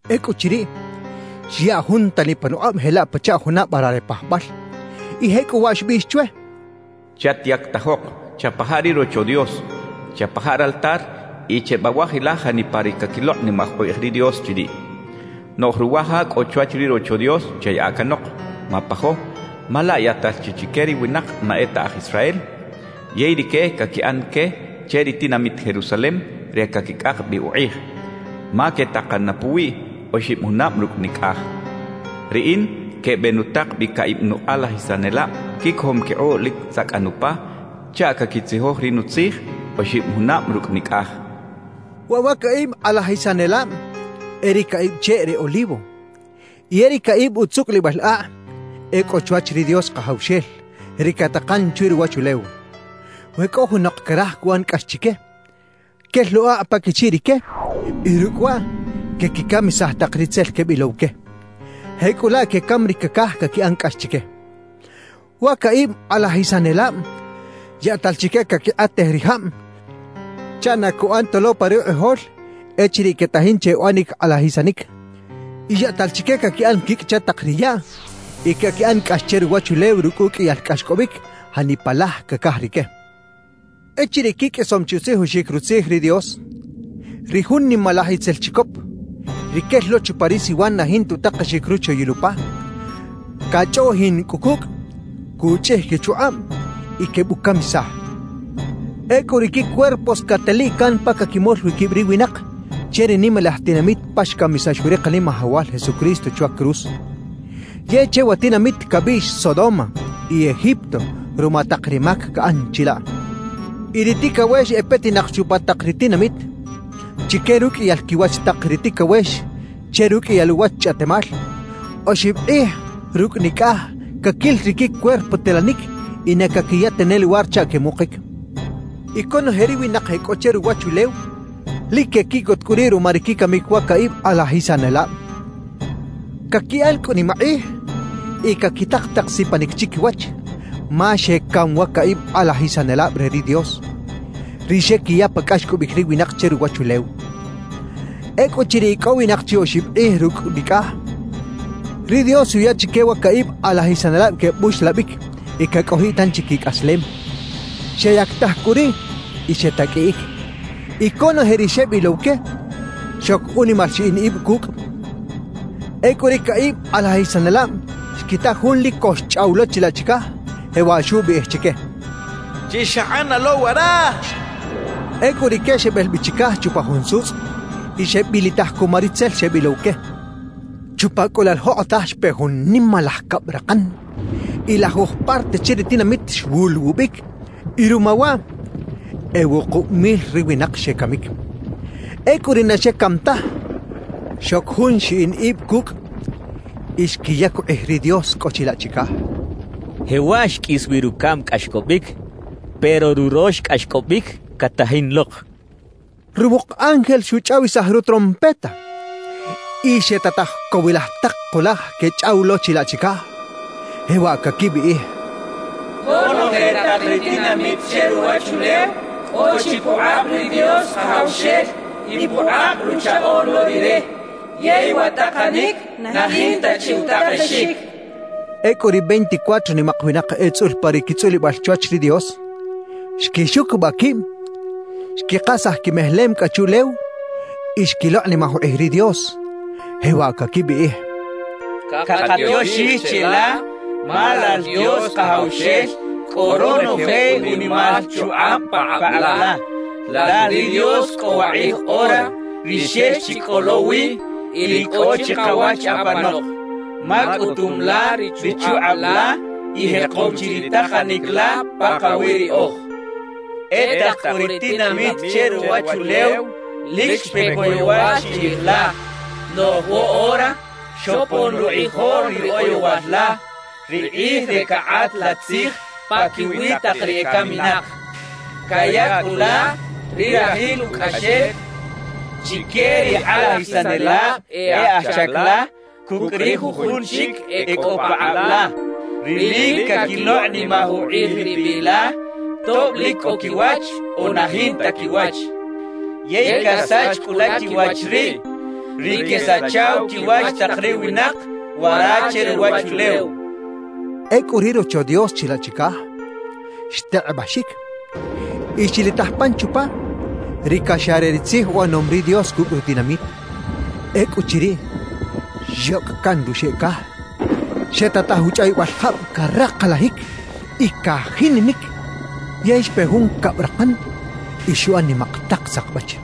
Ecꞌuchiriꞌ, xyaꞌ jun tani panukꞌab jelaꞌ pachaꞌ juna vara re pajbal y jecꞌuwaꞌ xbiꞌx chwe: «Chatyactajok, chapaja ri Rocho Dios, chapaja raltar y chebawajilaj janipa ri caquilokꞌnimaj ukꞌij ri Dios chiriꞌ. Noꞌj ruwa ja cꞌo chwach ri Rocho Dios chayaꞌa canok; mapajo, ma laꞌ yaꞌtal chi chique ri winak na e ta aj Israel; yey rique caquiꞌan que che ri tinamit Jerusalem re caquicꞌak bi ukꞌij, ma quetakan na puwiꞌ oxib junab rucꞌ nicꞌaj» xchaꞌ. Riꞌin quebenutak bi caꞌib nukꞌalajisanelab quicojom quikꞌuꞌ lic tzacꞌan upa chaꞌ caquitzijoj ri Nutzij oxib junab rucꞌ nicꞌaj. Waꞌ wa caꞌib kꞌalajisanelab e ri caꞌib cheꞌ re olivo y e ri caꞌib utzucꞌulibal akꞌ e cꞌo chwach ri Dios Kajawxel, ri catakan chwi ruwachulew. We cꞌo junok caraj cuꞌan cꞌax chique, quel lo akꞌ pa quichiꞌ rique y rucꞌ waꞌ quequicamisaj tak ri tzel quebilow que. Jecꞌulaꞌ quecam ri cacaj caquiꞌan cꞌax chique. Wa caꞌib kꞌalajisanelab yaꞌtal chique caquikꞌatej ri jab chaꞌ na cuꞌan ta lo pa rukꞌijol echiriꞌ quetajin che uꞌanic kꞌalajisanic; y yaꞌtal chique caquiꞌan quicꞌ che tak ri yaꞌ y caquiꞌan cꞌax che ruwachulew rucꞌ uqꞌuiyal cꞌaxcꞌobic janipa laj cacaj rique. Echiriꞌ quiqꞌuisom chi utzijoxic Rutzij ri Dios, ri jun nimalaj itzel chicop, ri quel lo chupa ri siwan na jinta utakexic ruchoyil upa, cachꞌoꞌjin cꞌu cucꞌ, cuchꞌij quichukꞌab y quebucamisaj. Ecꞌu ri quicuerpos cateliꞌ can pa caquimol wi quib ri winak che ri nimalaj tinamit pa xcamisax wi ri Kanimajawal Jesucristo chwa cruz. Yey che wa tinamit cabiꞌx “Sodoma” y “Egipto” ruma tak ri mac caꞌan chilaꞌ. Y ri ticawex e petinak chupa tak ri tinamit, chique ruqꞌuiyal quiwach tak ri ticawex che ruqꞌuiyal uwach chꞌaꞌtemal, oxib kꞌij rucꞌ nicꞌaj caquil ri quicuerpo telanic y na caquiya tane luwar chaꞌ quemukic. Y conoje ri winak e cꞌo che ruwachulew lic quequiꞌcot cꞌu riꞌ ruma ri quicamic wa caꞌib kꞌalajisanelab. Caquiꞌan cꞌu nimakꞌij y caquitak tak sipanic chiquiwach, ma xecam wa caꞌib kꞌalajisanelab re ri Dios, ri xequiya pa cꞌaxcꞌobic ri winak che ruwachulew. Ecꞌuchiriꞌ icꞌowinak chi oxib kꞌij rucꞌ nicꞌaj, ri Dios xuya chique wa caꞌib kꞌalajisanelab quebuxlabic y cacꞌojiꞌ tanchi quicꞌaslem. Xeyactaj cꞌu riꞌ y xetaqꞌuiꞌic. Y conoje ri xebilow que, xoc unimal xiꞌin ib cucꞌ. Ecꞌu ri caꞌib kꞌalajisanelab xquita Jun lic co xchꞌaw lo chilaꞌ chicaj, jewaꞌ xubiꞌij chique: «Chixakꞌana lo wara» xchaꞌ. Ecꞌu rique xebel bi chicaj chupa jun sutzꞌ y xebilitaj cuma ri tzel xebilow que. Chupa cꞌu laꞌ la jokꞌotaj xpe jun nimalaj cabrakan y lajuj parte che ri tinamit xwuluwubic; y ruma waꞌ e wukub mil ri winak xecamic. Ecꞌu ri na xecam taj, xoc jun xiꞌin ib cucꞌ y xquiyac ukꞌij ri Dios cꞌo chilaꞌ chicaj. Jewaꞌ xqꞌuis wi rucaꞌm cꞌaxcꞌobic, pero rurox cꞌaxcꞌobic catajin lok. Ruwuk ángel xuchꞌawisaj rutrompeta, y xetataj cowilaj tak kulaj quechꞌaw lo chilaꞌ chicaj, jewaꞌ caquibiꞌij: «Conoje tak ri tinamit che ruwachulew cꞌo chi pukꞌab ri Dios Kajawxel y pukꞌab Ruchaꞌoꞌn lo Rire; yey wa takanic na jinta chi utakexic» quechaꞌ. Ecꞌu ri veinticuatro nimak winak etzꞌul pa ri quitzꞌulibal chwach ri Dios, xquixucubaꞌ quib, xquikasaj quimejelem cꞌa chuꞌlew y xquilokꞌnimaj ukꞌij ri Dios. Jewaꞌ caquibiꞌij: «Cakatioxij cheꞌla, ma Lal Dios Kajawxel cꞌo ronoje unimal chukꞌab pakꞌab la, Lal ri Dios cꞌo wakꞌij ora, ri xex chi cꞌo lo wi, y ri cꞌo chikawach apanok; ma cꞌutum la ri chukꞌab la y jekom chi ri takanic la pakawi riꞌoj. E tak cꞌu ri tinamit che ruwachulew lic xpe coyowal chiꞌij la. Noꞌj woꞌora xopon rukꞌijol ri oyowal la, ri kꞌij re cakꞌat la tzij paquiwi tak ri ecaminak. Caya cꞌu la ri rajil ucꞌaxel chique ri kꞌalajisanelab e aj chac la cucꞌ ri jujun chic e cꞌo pakꞌab la, ri lic caquilokꞌnimaj ukꞌij ri biꞌ la, tob lic cꞌo quiwach o na jinta quiwach; yey casach cꞌu la quiwach riꞌ ri quesachaw quiwach tak ri winak wara che ruwachulew» quechaꞌ. Ecꞌu ri Rocho Dios chilaꞌ chicaj, xtekꞌebaxic; y xilitaj pan chupa, ri caxa re ri tzij uꞌanom ri Dios cucꞌ rutinamit. Ecꞌuchiriꞌ, xyocꞌ caꞌn ruxeꞌ caj, xetataj uchꞌawibal jab caraklajic y cajininic; yey xpe jun cabrakan, y xuꞌan nimak tak sakbach.